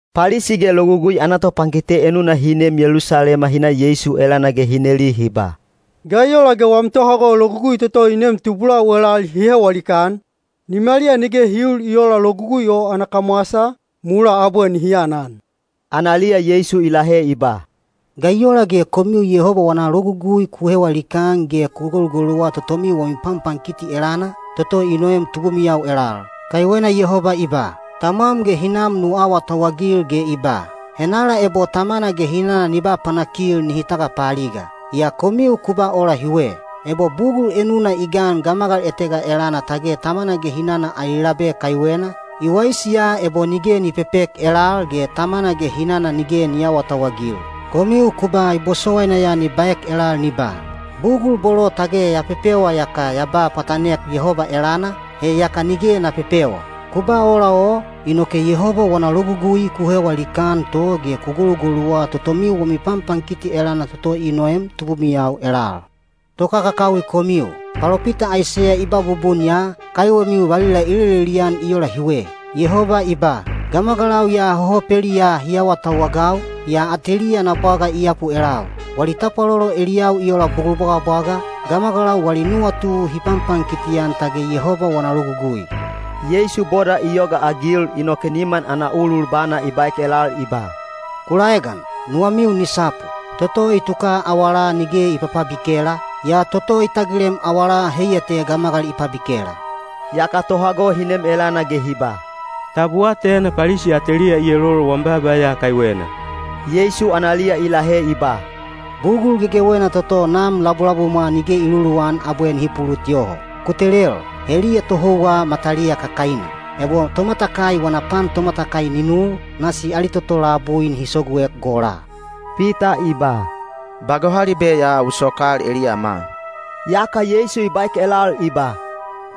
Palisi ge Logugui ana topankite enuna hi neem Yelusalema hi na Yeisu elana ge hi neli hi ba, “Ga i ola ge wam tohago logugui toto i neem tubulau elal hi hewa likaan? Nimaliya nige hi uul i oola logugui o ana kamwasa, mulaa abwe nihi anan.” Analiya Yeisu i lahe i ba, “Ga i ola ge komiu Yehoba wana logugui ku hewa likaan ge ku golugoluwa totomiu wami panpankiti elana, toto i noem tubumiyau elal? Kaiwena Yehoba i ba, ‘Tamwam ge hinam nu awatauwagil’ ge i ba, ‘Henala ebo tamana ge hinana ni ba panakil nihi tagapaaliga.’ Yaa komiu ku ba ola hiwe: Ebo bugul enuna i gan gamagal etega elana tage tamana ge hinana ali labe kaiwena, i waisi ya ebo nige ni pepek elal ge tamana ge hinana nige ni aawatauwagil. Komiu ku ba i bosowaina ya ni baek elal ni ba, ‘Bugul bolo tage ya pepewa iyaka ya ba pwatanek Yehoba elana, he yaka nige na pepewa.’ Ku ba ola o, inoke Yehoba wana logugui ku hewa likaan to ge ku golugoluwa totomiu wami panpankiti elana toto i noem tubumiyau elal. Tokakakawi komiu! Palopita Aiseya i ba bubun ya, kaiwemiu valila i lelelian i ola hiwe: Yehoba i ba, ‘Gamagalau ya hohopeliyaa hi awatauwagau, yaa ateliya ana bwaga i yapu elau. Wali tapwalolo eliyau i ola bugul bwagabwaga, gamagalau wali nuwatu hi panpankiti-an tage Yehoba wana logugui.’” Yeisu boda i yogaagil inoke niman ana ulul bana i baek elal i ba, “Ku laegan! Nuwamiu ni sapu! Toto i tuka awalaa nige i papabikela, yaa toto i tagilem awalaa heiya te gamagal i pabikela.” Yaka tohago hi nem elana ge hi ba, “Tab u atena Palisi ateliya i elolol wam baaba ya kaiwena?” Yeisu analiya i lahe i ba, “Bugul gegewena toto Nam labulabumwa nige i luluwan abwe nihi pulut yoho. Ku telel! Heliya tohouwa mataliya kakaina. Ebo tomatakai wana pan tomatakai ni nul, nasi ali toto labui nihi soguek gola.” Pita i ba, “Ba gohalibe ya u sokal eliyama.” Yaka Yeisu i baek elal i ba,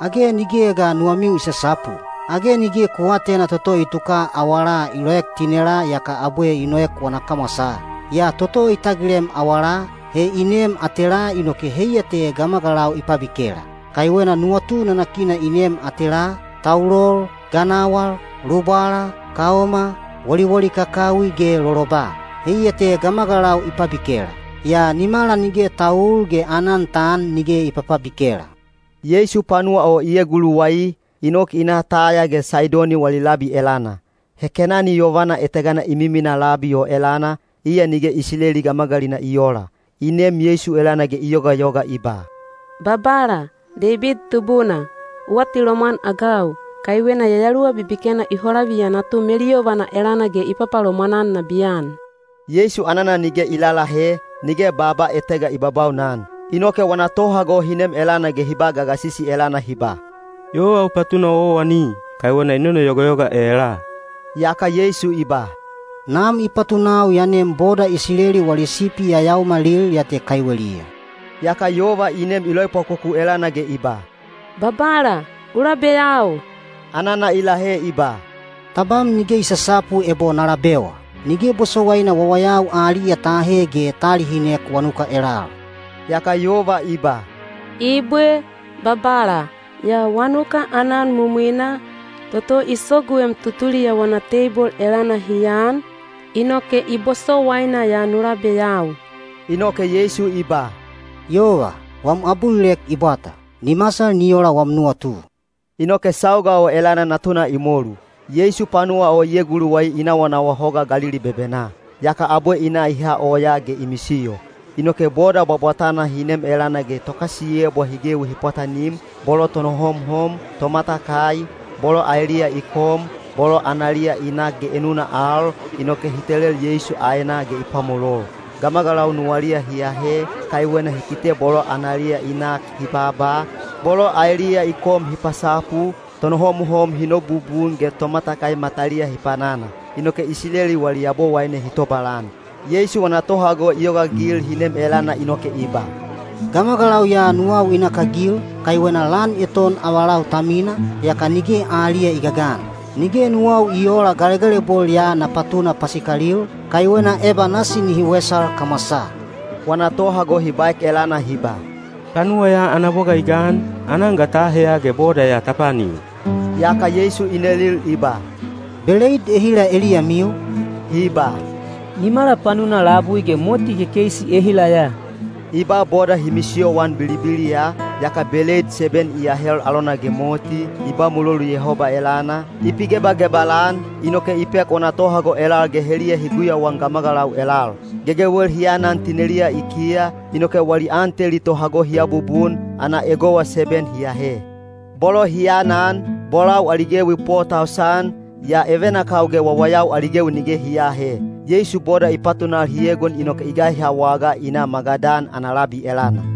“Age nigeya ga nuwamiu i sasapu? Age nige ku aatena toto i tuka awalaa i loek tinelaa yaka abwe i noek wana kamwasaa? Yaa toto i tagilem awalaa, he i neem atelaa inoke heiya te gamagalau i pabikela. Kaiwena nuwatu nanakina i neem atelaa: taulol, ganawal, lubwala, kaoma, woliwoli kakawi ge loloba. Heiya te gamagalau i pabikela; yaa nimala nige ta uul ge aanan ta an nige i papabikela.” Yeisu panuwa o i eguluwai, i nok i na Taya ge Saidoni wali labi elana. He Kenani yovana etegana i miminaa labi o elana, iya nige Isileli gamagalina i oola. I nem Yeisu elana ge i yogayoga i ba, “Babala, Deibid Tubuna, u atilomwan-agau! Kaiwena yayaluwa bibikena i holaviya natu meluyovana elana ge i papalomwan-an nabiyan.” Yeisu anana nige i lalahe, nige baaba etega i babaunan. Inoke wana tohago hi nem elana ge hi ba gagasisi elana hi ba, “Yova u patuna owaowani, kaiwena i nonoyogayoga elaa.” Yaka Yeisu i ba, “Nam i patunau ya nem boda Isileli wali sipi yayaomalil ya te kaiweliya.” Yaka yova i nem i loepwakoku elana ge i ba, “Babala, u labeyau.” Anana i lahe i ba, “Tabam nige i sasapu ebo na labewa. Nige bosowaina wawayau aliya ta ahe ge ta alihinek wanuka elal.” Yaka yova i ba, “Ibwe, Babala. Yaa wanuka aanan mumwina, toto i soguem tutuliya wana teibol elana hi an, inoke i bosowaina ya nu labeyau.” Inoke Yeisu i ba, “Yova, wam abulilek i bwata. Ni masal ni ola wam nuwatu.” Inoke sauga o elana natuna i molu. Yeisu panuwa o i eguluwai i nawanawa Hoga Galili bebenaa. Yaka abwe i na i ha oyaa ge i misiyo. Inoke boda bwabwatana hi nem elana ge tokasiyebwa hi gewi hi pwatanim, bolo tonohomhom, tomatakai, bolo aeliya i kom, bolo analiya i nak ge enuna al, inoke hi telel Yeisu aenaa ge i pwamolol. Gamagalau nuwaliya hi ahe, kaiwena hi kite bolo analiya i nak hi baaba, bolo aeliya i kom hi pasapu, tonohomhom hi nobubun ge tomatakai mataliya hi panana. Inoke Isileli wali Yabowaine hi tobalan. Yeisu wana tohago i yogaagil hi nem elana inoke i ba, “Gamagalau ya nuwau i nakagil, kaiwena lan eton avalau ta mina, yaka nige aliya i gagan. Nige nuwau i oola galegalebol ya na patuna pasikalil, kaiwena eba nasi nihi wesal kamwasaa.” Wana tohago hi baek elana hi ba, “Panuwa ya ana bwaga i gan, aanan ga ta aheya ge boda ya ta paanil?” Yaka Yeisu i nelil i ba, “Beleid ehila eliyamiu?” Hi ba, “Nimala panuna labui ge moti kekeisi ehila ya.” I ba boda hi misiyoan bilibiliya, yaka beleid seben i ahel alona ge moti, i ba mulolu Yehoba elana, i pigebagebal-an, inoke i pek wana tohago elal ge heliya hi guyauan gamagalau elal. Gegewel hi anan tineliya i kiya, inoke wali an teli tohago hi abubun, ana egowa seben hi ahe. Bolo hi anan, bolau ali gewi po tausan, yaa evenakau ge wawayau ali gewi nige hi aahe. Yeisu boda i patunal hi egon inoke i gaiha wagaa i na Magadan ana labi elana.